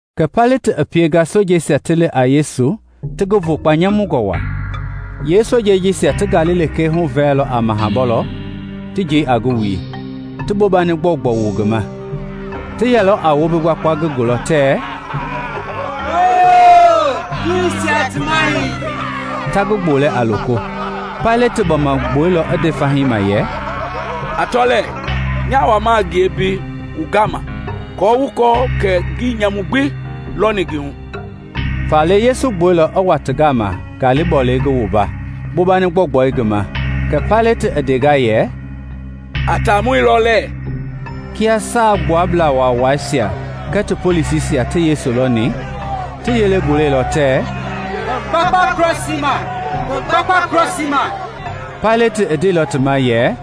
Kɛ Paileti i pienga sojeisia ti li a Yesu ti ngi vogba nyamungɔ waa. Yeesojeisia ti ngali lekee huvɛlɛilɔ a maha bɔlei, ti njei a ngi wui, ti bobani gbɔugbɔu wu ngi ma. Ti yɛlɔ a wombi gbakpa ngi gɔwɔbu tɛɛ, “Hooyoo, Juuisia ti Mahɛi!” ta ngi gbolɛ a loko. Paileti i gbɔma gbuɛilɔ i nde fahii ma yɛ, “A tɔ lɛɛ, nya wama a ngie mbei wu gama aako wu kɔɔ kɛ ngii nyamu gbi lɔni ngi hu.” Faale Yesu i gbuɛilɔ i wa ti gama ngali bɔlei i ngi wumba, bobani gbɔugbɔi i ngi ma. Kɛ Paileti i ndenga yɛ, “A taamɔi lɔ lɛɛ!” Kia Saagbuablaa Waawaisia kɛɛ ti polisisia ti Yesu lɔni, ti yelei gulɛilɔ tɛɛ, “Ngi gbakpa krɔsii ma! Ngi gbakpa krɔsii ma!” Paileti i ndeilɔ ti ma yɛ,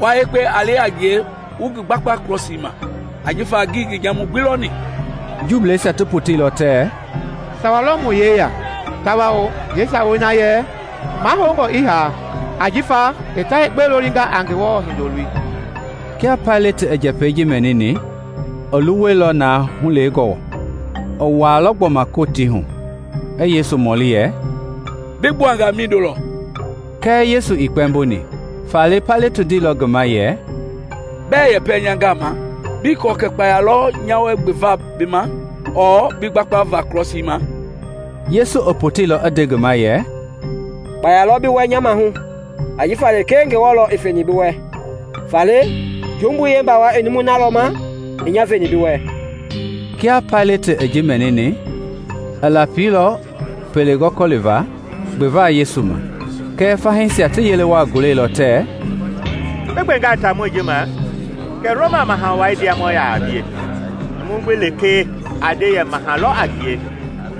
“Wua yekpe a li a ngie wu ngi gbakpa krɔsii ma, ajifa ngii ngi nyamu gbi lɔni.” Juuisia ti poteilɔ tɛɛ, “Sawa lɔ mu yeya tawao yeesawei na yɛ mahoungɔ i haa ajifa i ta yekpe lolinga a Ngewɔ Hindoloi.” Kia Paileti i njɛpɛi ji mɛnini, i luwɛilɔ na hulewengɔ. I wuailɔ gbɔma Kotii hu i Yesu mɔli yɛ, “Bi gbuanga mindo lɔ?” Kɛɛ Yesu ii kpɛmboni. Faale Paileti ndeilɔ ngi ma yɛ, “Bɛɛ yepe nya gama? Bii kɔɔ kɛ kpaya lɔ nya wɛ gbeva bi ma ɔɔ bi gbakpava krɔsii ma?” Yesu i poteilɔ i nde ngi ma yɛ, “Kpaya lɔ bi wɛ nya maahu ajifa lekee Ngewɔ lɔ i feni bi wɛ. Faale jumbui yeembawai i numui na lɔ ma i nya veni bi wɛ.” Kia Paileti i ji mɛnini, i lapilɔ pele gɔliva gbeva Yesu ma kɛɛ fahii ti yele waa gulɛilɔ tɛɛ, “Bi gbengaa taamɔi ji ma kɛ Roma Maha Wai ndiamɔ yaa a bie; numu gbi lekee a nde yɛ maha lɔ a ngie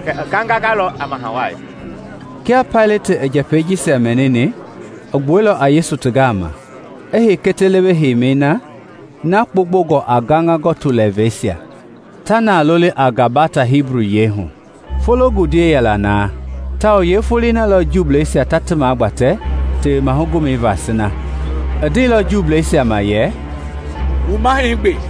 kɛ i gangangalɔ a Maha Wai.” Kia Paileti i njɛpɛi jisia mɛnini i gbuɛilɔ a Yesu ti gama, i hei kiti lewe heimi hindei na na gbomgbongɔ a gaŋa gɔtu lɛɛvɛisia, ta na loli a Gabata Hibu yiɛi hu. Fologundiei yɛla na tawao yeefoloi na lɔ Juuisia ta ti magbatɛ Tewema Gomɛi va sina. I ndeilɔ Juuisia ma yɛ, “Wu Mahɛi gbe!”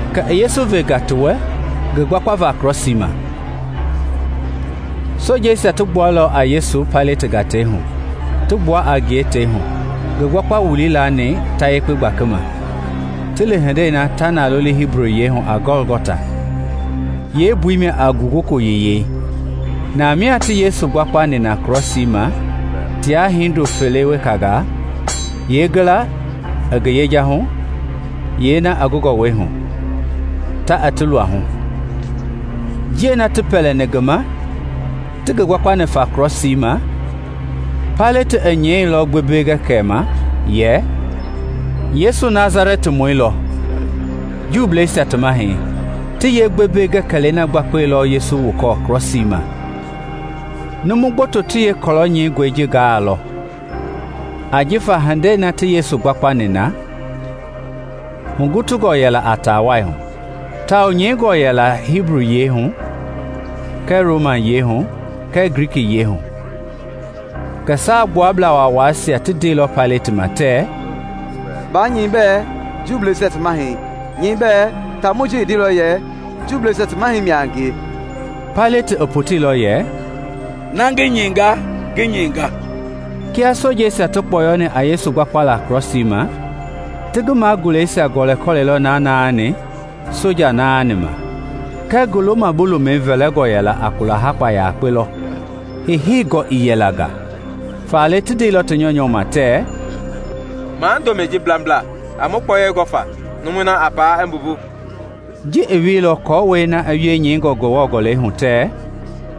Kɛ i Yesu venga ti wɛ ngi gbakpava krɔsii ma. Sojeisia ti gbuɛilɔ a Yesu Paileti gatei hu, ti gbua a ngie tei hu, ngi gbakpa-wulii laani ta yekpe gbakima, ti li hindei na ta na loli Hibu yiɛi hu a Gɔlgɔta, yeembui mia a Ngugoko Yiyei. Namia ti Yesu gbakpani na krɔsii ma tia hindo fele wekangaa, yeengila i ngi yejahui, yeena i ngi gɔwɔhui, ta i ti luahu. Njiɛi na ti pɛlɛni ngi ma, ti ngi gbakpani fa krɔsii ma, Paileti i nyɛilɔ gbembele-gɛkɛlɛi ma yɛ, “Yesu Nasalɛtimɔi lɔ, Juuisia ti Mahɛi,” ti yeegbembele-gɛkɛlɛi gbakpa Yesu wukɔɔ krɔsii ma. Numu gboto ti yeekɔlɔ nyɛingɔi ji gaailɔ, ajifa hindei na ti Yesu gbakpani na hugutungɔ yɛla a taa wai hu; tawao nyɛingɔ yɛla Hibuyiɛi hu kɛɛ Romayiɛi kɛɛ Glikiyiɛi. Kɛɛ Saagbuablaa Waawaisia ti ndeilɔ Paileti ma tɛɛ, “Baa nyɛi bɛɛ ‘Juuisia ti Mahɛi,’ nyɛi bɛɛ, ‘Taamɔi ji i ndeilɔ yɛ Juuisia ti Mahɛi mia a ngie.’” Paileti i poteilɔ yɛ, “Na ngi nyɛinga, ngi nyɛinga.” Kia sojeisia ti kpɔyɔni a Yesu gbakpala krɔsii ma, ti ngi maguleisia gɔlɛilɔ na naani soja naani ma. Kɛɛ ngi loma-bu-lomɛi vɛlɛngɔ yɛla a kula-hakpa yakpe lɔ, heiheingɔ ii yɛla nga. Faale ti ndeilɔ ti nyɔunyɔ ma tɛɛ, “Maa ndomɛi ji blambla, a mu kpɔyei gɔ fa, numui na a paa i mbumbu.” Ji i wieilɔ aako na i wie nyɛingɔ Ngewɔ Gɔlɛi hu tɛɛ,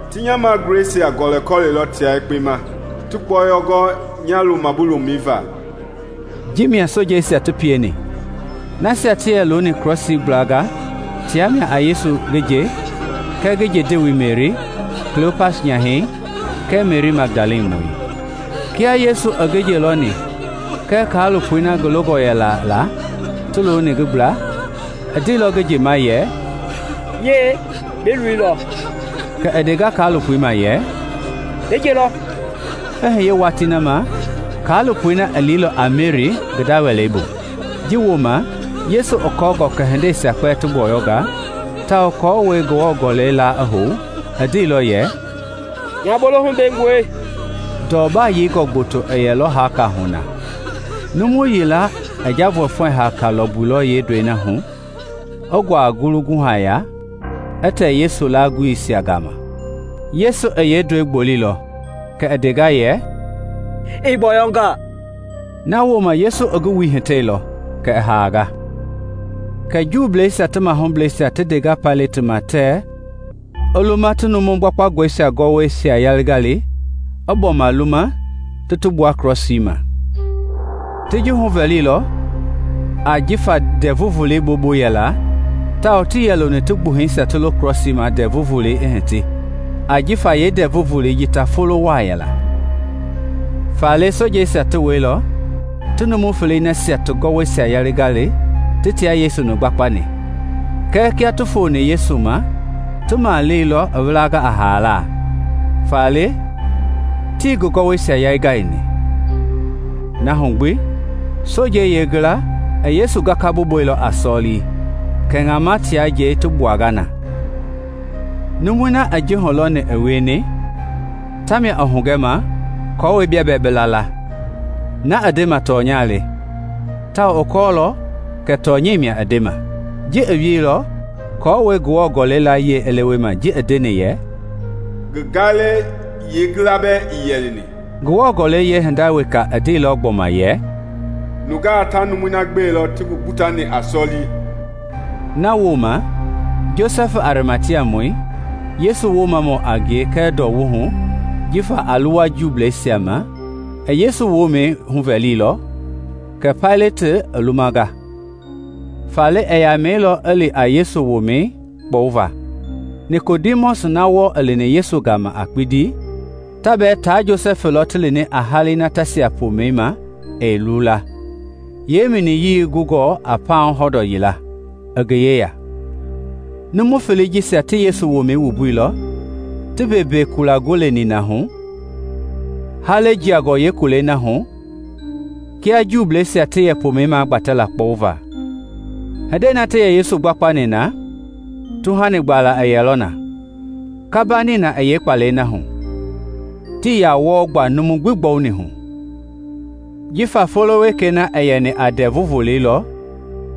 “Ti nya maguleisia gɔlɛkɔlɛilɔ tia yekpe ma, ti kpɔyei gɔ nya loma-bu-lomɛi va.” Ji mia sojeisia ti pieni. Nasia ti yɛ looni krɔsii gbla tia mia a Yesu ngi nje kɛɛ ngi nje ndewei Meri, Klopas nyahɛi kɛɛ Meri Magdalamɔi. Kia Yesu i ngi nje lɔni kɛɛ kaalopoi na ngi longɔ yɛla la ti looni ngi gbla, i ndeilɔ ngi nje ma yɛ, “Yie, bi loi lɔ!” Kɛ i ndenga kaalopoi ma yɛ, “Bi nje lɔ!” I hiye watii na ma kaalopoi na i liilɔ a Meri ngi nda wɛlei bu. Ji wooma, Yesu i kɔɔngɔ kɛ hindei gbi i gbɔyɔnga, tawao aako Ngewɔ Gɔlɛi la i hou, i ndeilɔ yɛ, “Nya bolohu bengɔi.” Ndɔ baa yeingɔ gboto i yɛlɔ haaka hu na; numu yila i njavɔɛfɔɛ-hani lɔmbuilɔ yeendɔi hu, i nguaa ngulu guhɛi ya, i tɛ Yesu laagulisia gama. Yesu i yeendɔi gboleilɔ, kɛ i ndenga yɛ, “I gbɔyɔnga!” Na wooma Yesu i ngi wui hitɛilɔ kɛ i haanga. Kɛ Juuisia ti mahublɛisia ti ndenga Paileti ma tɛɛ i luma ti numu gbakpangɔisia ti gɔwɔisia yaingai, i gbɔma luma ti gbua krɔsiisia ma. Ti ji huvɛliilɔ ajifa Ndɛvu Volei bobu yɛla tawao tii yɛ loni ti gbuhɛisia ti lo krɔsiisia ma Ndɛvu Volei i hiti ajifa yeendɛɛvu Volei ji ta folo waa yɛla. Faale sojeisia ti wɛilɔ ti numu felei nasia ti gɔwɔisia yaingai ti tia Yesu-ni gbakpani. Kɛɛ kia ti foni Yesu ma ti maleni i wilanga a haala, faale tii ngi gɔwɔisia yaingaini. Na hu gbi sojeisia yilayee i Yesu gakamɛi gbuteilɔ a sɔlii, kɛ ŋamɛi tia njɛi ti gbuanga na. Numui na i ji hulɔni i wieni ta mia i hugɛnga aako bia bɛɛ bi la la. Na i ndeni tɔnya le, tawao i kɔɔlɔ kɛ tɔnyɛi mia i ndema. Ji i wieilɔ aako Ngewɔ Gɔlɛi layie i lewema ji i ndeni yɛ, “Ngi gaalɛi yeengila bɛɛ ɛɛ yali.” Ngewɔ Gɔlɛi yeehinda weka i ndeilɔ gbɔma yɛ, “Nungaa ta numui na gbelɔ ti ngi gbutani a sɔlii.” Na wooma Josɛfi Arimatiamɔi, Yesu Woomamɔ a ngie kɛɛ hulɔwungɔ jifa a luwa Juuisia ma, i Yesu womɛi huvɛliilɔ, kɛ Paileti i lumanga. Faale i yamɛilɔ i li a Yesu womɛi kpɔwuva. Nikodimɔsi na wɔɔ i lini Yesu gama a kpindi, ta bɛɛ tia Josɛfi lɔ ti lini a halei na ta sia pomɛi ma ɛɛ luula, yeeminiyii gungɔ a pauŋ hɔndɔɔ yila, i ngi yeya. Numu felei jisia ti Yesu womɛi wumbuilɔ, ti mbeembee kula gole nina hu, halei jiangɔ yeekulɛi na hu, kia Juuisia ti yɛ pomɛi magbatɛ la kpɔwuva. Hindei na ti Yesu gbakpani na, tuhani gbaala i yɛlɔ na, kamba nina i yeekpalɛi na hu, tii yaa wɔɔ gba numu gbi gbɔwuni hu. Jifa folo wekei na a yɛ a Ndɛvu Volei lɔ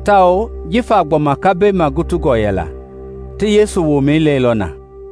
tawao jifa gbɔma kambɛi magutungɔ yɛla, ti Yesu womɛi lɛilɔ na.